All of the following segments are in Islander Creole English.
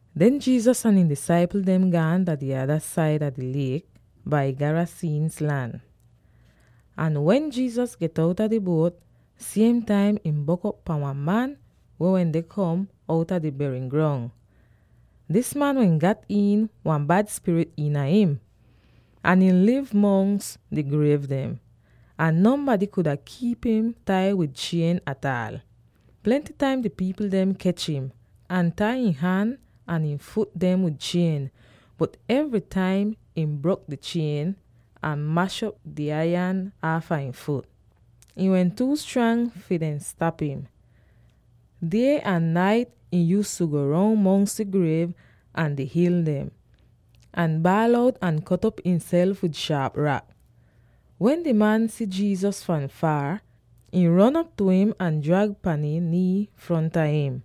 Den Jesus ahn ihn disaipl dem gaan dah di ada saida di liek dah Garasenes lan. Ahn wen Jesus get outa di buot, siem taim ihn bok'op pan wan man weh wende kom outa di berin grong. Dis man wehn gat iin wan bad spirit iina im. Ahn ihn liv mongs di griev dem, ahn nonbady kuda kiip im tai wid chien ataal. Plenty taim di pipl dem kech im, ahn tai ihn han ahn ihn fut dem wid chien, bot evry taim ihn brok di chien, ahn mash'op di aiyan aafa ihn fut. Ihn wehn tuu strang fi dehn stap im. Die ahn nait ihn yuuztu go roun mongs di griev ahn di hil dem, ahn baal out ahn kot'op imself wid shaap rak. Wen di man si Jesus fahn faar, ihn ron op tu im ahn drap pan ihn nii fronta im,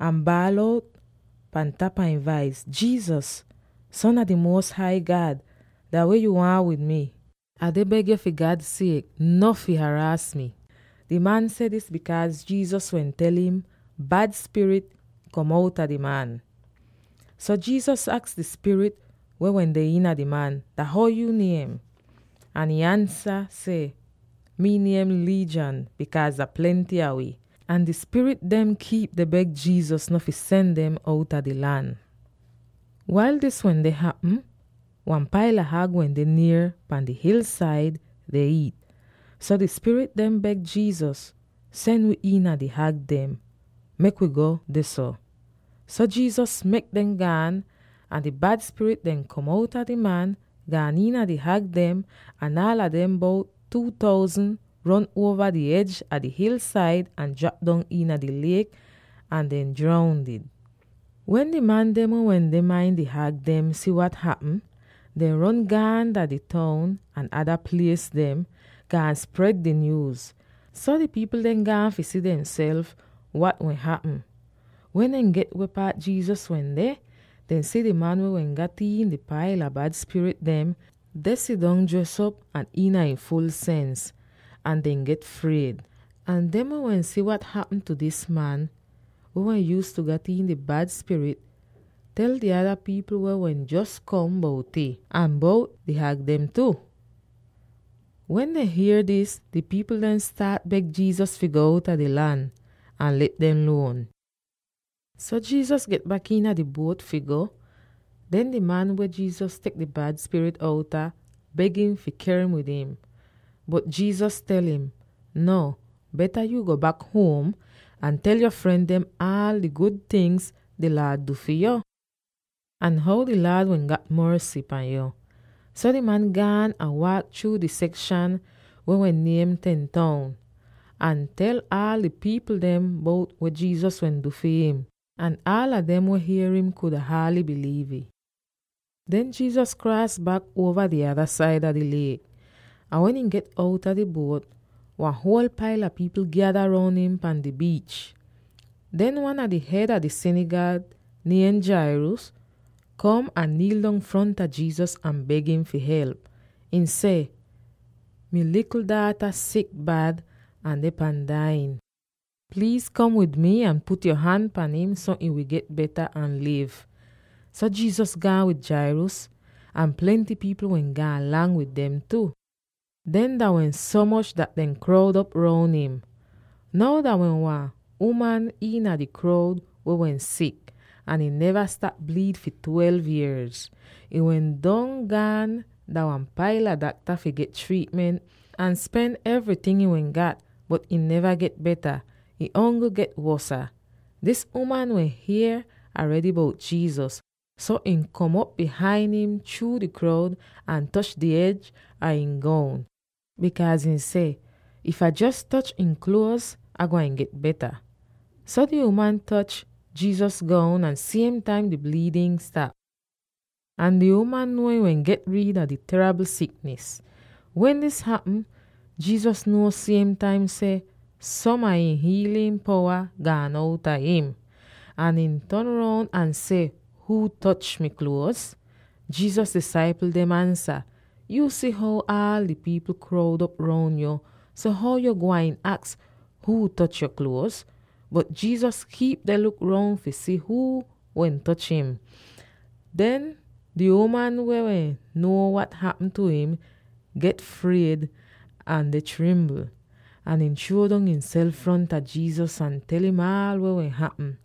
ahn baal out pan tapa ihn vais, “Jesus, Son a di Muos Hai God, dah weh yo waahn wid mi? Ah deh beg yo, fi God siek, no fi haraas mi!” Di man seh dis, bikaaz Jesus wehn tel im seh, “Bad spirit, kom outa di man!” So Jesus aks di spirit weh wende iina di man, “Dah how yo niem?” Ahn ihn ansa seh, “Mi niem ‘Legion’ bikaaz dah plenty a wi.” Ahn di spirit dem kiip deh beg Jesus no fi sen dem outa di lan. Wail dis wende hapm, wan paila hag wende nier pan di hilsaid deh iit. So di spirit dehn beg Jesus, “Sen wi iina di hag dem; mek wi go dehso!” So Jesus mek dem gaan, ahn di bad spirit dem kom outa di man, gaan iina di hag dem, ahn aala dem —bout two thousand— ron uova di ej a di hilsaid, ahn drap dong iina di liek ahn dehn droundid! Wen di man dem weh wende main di hag dem si wat hapm, dehn ron gaan dah di toun ahn ada plies dem, gaan spred di nyuuz. So di pipl dem gaan si fi demself wat wehn hapm. Wen dehn get weh paat Jesus wende, dehn si di man weh wehn gat iin di paila bad spirit dem, deh sidong dres op, ahn iina ihn ful sens, ahn dehn get fried. Ahn dem weh wehn si wat hapm tu dis man —weh wehn yuuztu gat iin di bad spirit— tel di ada pipl weh wehn jos kom bout'ih, ahn bout di hag dem tu. Wen dehn hier dis, di pipl dem staat beg Jesus fi go outa di lan, ahn let dem luon. So Jesus get bak iina di buot fi go. Den, di man, weh Jesus tek di bad spirit outa, beg im fi ker im wid im. Bot Jesus tel im, “Nuo, beta yo go bak huom ahn tel yo fren dem aal di gud tingz di Laad du fi yo, ahn how di Laad wehn gat morsy pan yu.” So di man gaan ahn waak chruu di sekshan weh wehn niem “Ten Town,” ahn tel aal di pipl dem bout weh Jesus wehn du fi him. Ahn aala dem weh hier im kuda haaly biliiv'ih. Den Jesus kraas bak uova di ada saida di liek. Ahn wen ihn get outa di buot, wan huol paila pipl gyada roun im pan di biich. Den wan a di hed a di sinigag, niem Jairus, kom ahn niil dong fronta Jesus ahn beg im fi help. Ihn seh, “Mi likl daata sik bad, ahn deh pan dai'in. Pliiz kom wid mi ahn put yo han pan im so ihn wi get beta ahn liv.” So Jesus gaan wid Jairus, ahn plenty pipl wehn gaan lang wid dem tu. Dehn dah wehn so moch dat dehn kroud op roun im. Now dah wehn wan uman iina di kroud weh wehn sik, ahn ihn neva stap bliid fi twelve yierz. Ihn wehn don gaan dah wan paila dakta fi get triitment, ahn spen evryting ihn wehn gat, bot ihn neva get beta; ihn ongl get wosa. Dis uman wehn hier aredy bout Jesus, so ihn kom op bihain im chruu di kroud ahn toch di ej a ihn goun, bikaaz ihn seh, “If Ah jos toch ihn kluoz, Ah gwain get beta.” So di uman toch Jesus goun ahn siem taim di bliidn stap, ahn di uman nuo ihn wehn get rid a di teribl siknis. Wen dis hapm, Jesus nuo siem taim seh som a ihn hiilin powa gaan outa im. Ahn ihn ton roun ahn seh, “Huu toch mi kluoz?” Jesus disaipl dem ansa, “Yuu si how aal di pipl kroud op roun yo. So how yu gwain aks huu toch yo kluoz?” Bot Jesus kiip deh luk roun fi si huu wehn toch im. Den di uman, weh wehn nuo wat hapm tu im, get fried, ahn deh trimbl, ahn ihn chruo dong imself fronta Jesus, ahn tel im aal weh wehn hapm.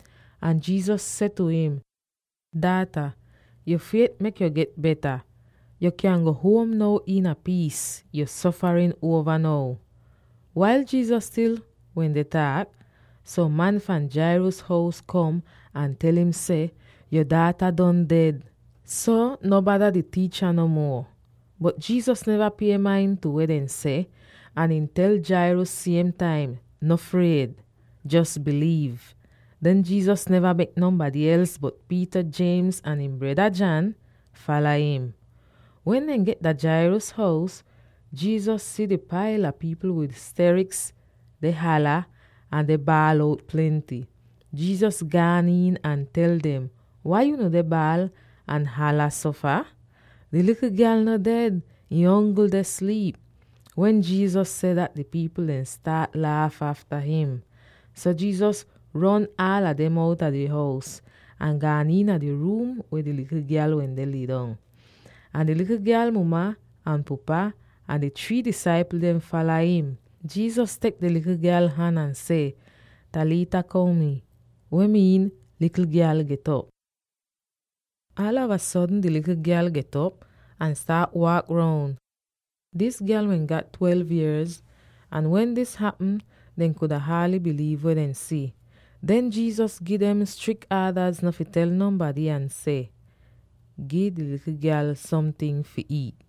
Ahn Jesus seh tu im, “Daata, yo fiet mek yo get beta. Yo kyan go huom now iina piis. Yo sofarin uova now.” Wail Jesus stil wende taak, som man fahn Jairus hous kom, ahn tel im seh, “Yo daata don ded; so no bada di tiicha no muo.” Bot Jesus neva pie main tu weh dehn seh, ahn ihn tel Jairus siem taim, “No fried; jos biliiv.” Den Jesus neva mek nonbady els bot Peter, James, ahn ihn breda, John, fala im. Wen dehn get dah Jairus hous, Jesus si di paila pipl wid steriks, deh hala, ahn deh baal out plenty. Jesus gaan iin ahn tel dem, “Wai unu deh baal ahn hala so fah? Di likl gyal no ded; ihn ongl deh sliip.” Wen Jesus seh dat, di pipl dehn staat laaf afta im. So Jesus ron aala dem outa di hous, ahn gaan iina di ruum weh di likl gyal wende lidong. Ahn di likl gyal muma ahn pupa, ahn di three disaipl dem fala im. Jesus tek di likl gyal han ahn seh, “Talitha koum,” weh miin, “Likl gyal, get'op!” Aalava sodn di likl gyal get'op, ahn staat waak roun! Dis gyal wehn gat twelve yierz, ahn wen dis hapm, dehn kuda haaly biliiv weh dehn si. Den Jesus gi dem strik aadaz no fi tel nonbady ahn seh, “Gi di likl gyal somting fi iit.”